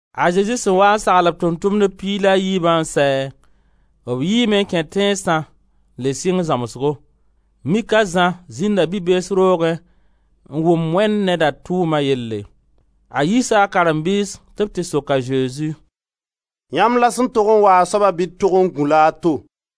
A Zezi sẽn waa n sagl b Tʋʋm-tʋmdb piig la a yiibã n sɛ, b yiime n kẽ tẽnsã n le sɩng zãmsgo. Mik a Zã zĩnda bi-bees roogẽ n wʋm Wẽnd Neda tʋʋma yelle. A yiisa a karen-biis tɩ b tɩ sok a Zezi: «Yãmb la sẽn tog n waa soaba bɩ d tog n gũ-la a to?»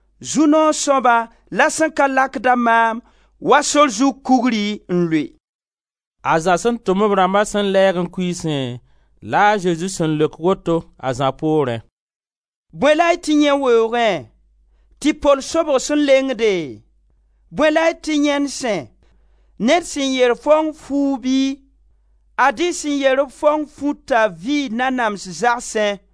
zu-noog soaba la sẽn ka lakd-a maam wa sor zug kugri n lʋɩ.» A Zã sẽn tʋm b rãmba sẽn lɛɛg n kuiisẽ la a Zezi sẽn leok woto a Zã poorẽ: «Bõe la y tɩ yãe weoogẽ, tɩ-pol sobg sẽn lengde? Bõe la y tɩ yãend sẽ? Ned sẽn yer faong fuugu bɩ? Ad-y sẽn yer-b faong futa vɩɩ nanams zagsẽ.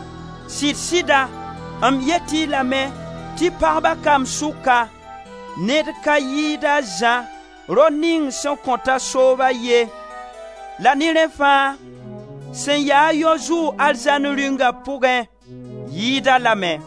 Sɩd-sɩda, m yet-y lame tɩ pagba kamb sʋka, ned ka yɩɩd a Zã, rao ning sẽn kõta sooba ye, la ne rẽ fãa sẽn ya-a yao zʋʋg Arzãn Rĩunga pʋgẽ, yɩɩd-a lame.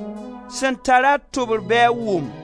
Sẽn tar-a tʋbr bɩ a wʋm!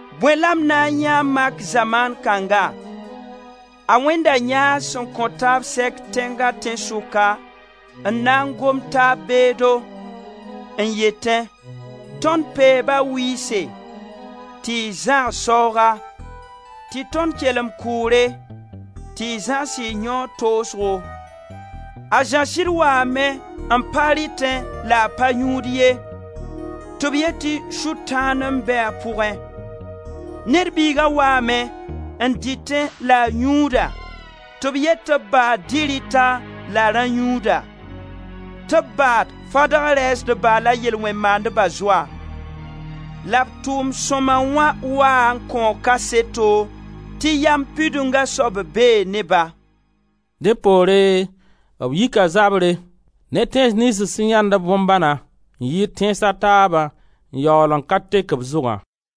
Bõe la m na n yãe n mak zamaan kãnga? A wẽnda yãas sẽn kõ taab sɛk tẽnga tẽnsʋka, n na n gom taab beedo, n yetẽ: ‹Tõnd peeba wɩɩse, tɩ y zãgs saooga, tɩ tõnd kelem kʋʋre, tɩ y zãgs y yãoog toosgo!› A Zã sɩd waame n pa rɩtẽ la a pa yũud ye, tɩ b yet tɩ Sʋtãan n be a pʋgẽ. Ned Biiga waame, n dɩtẽ la a yũuda, tɩ b yet tɩ b baad dɩ-rɩta la rã-yũuda, tɩ b baad fadg rɛɛsdba la yel-wẽn-maandba zoa. La b tʋʋm sõma wã waa n kõo kaseto tɩ Yam Pidunga soab bee ne-ba. Dẽ poore b yika zabre ne tẽns niyns sẽn yãend-b bõn-bãna n yɩɩd tẽns a taaba n yaool n ka tek b zʋgã.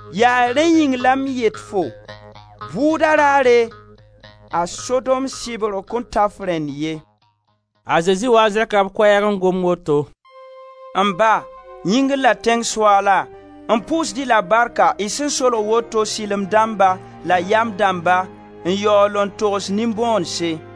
Yaa rẽ yĩng la m yet-fo: bʋʋda raare, a Sodom sɩbgr kõn ta f rẽnd ye.» A Zezi waa n zẽka b koɛɛg n gom woto: «M Ba, yĩngr la tẽng Soaala, m pʋʋsd-y la barka y sẽn solg woto sɩlem dãmba la yam dãmba n yaool n togs nin-bõonese.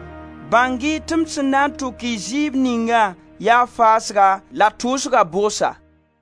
Bãng-y tɩ m sẽn na n tʋk-y zɩɩb ninga yaa faasga la tʋʋsga bʋgsa.»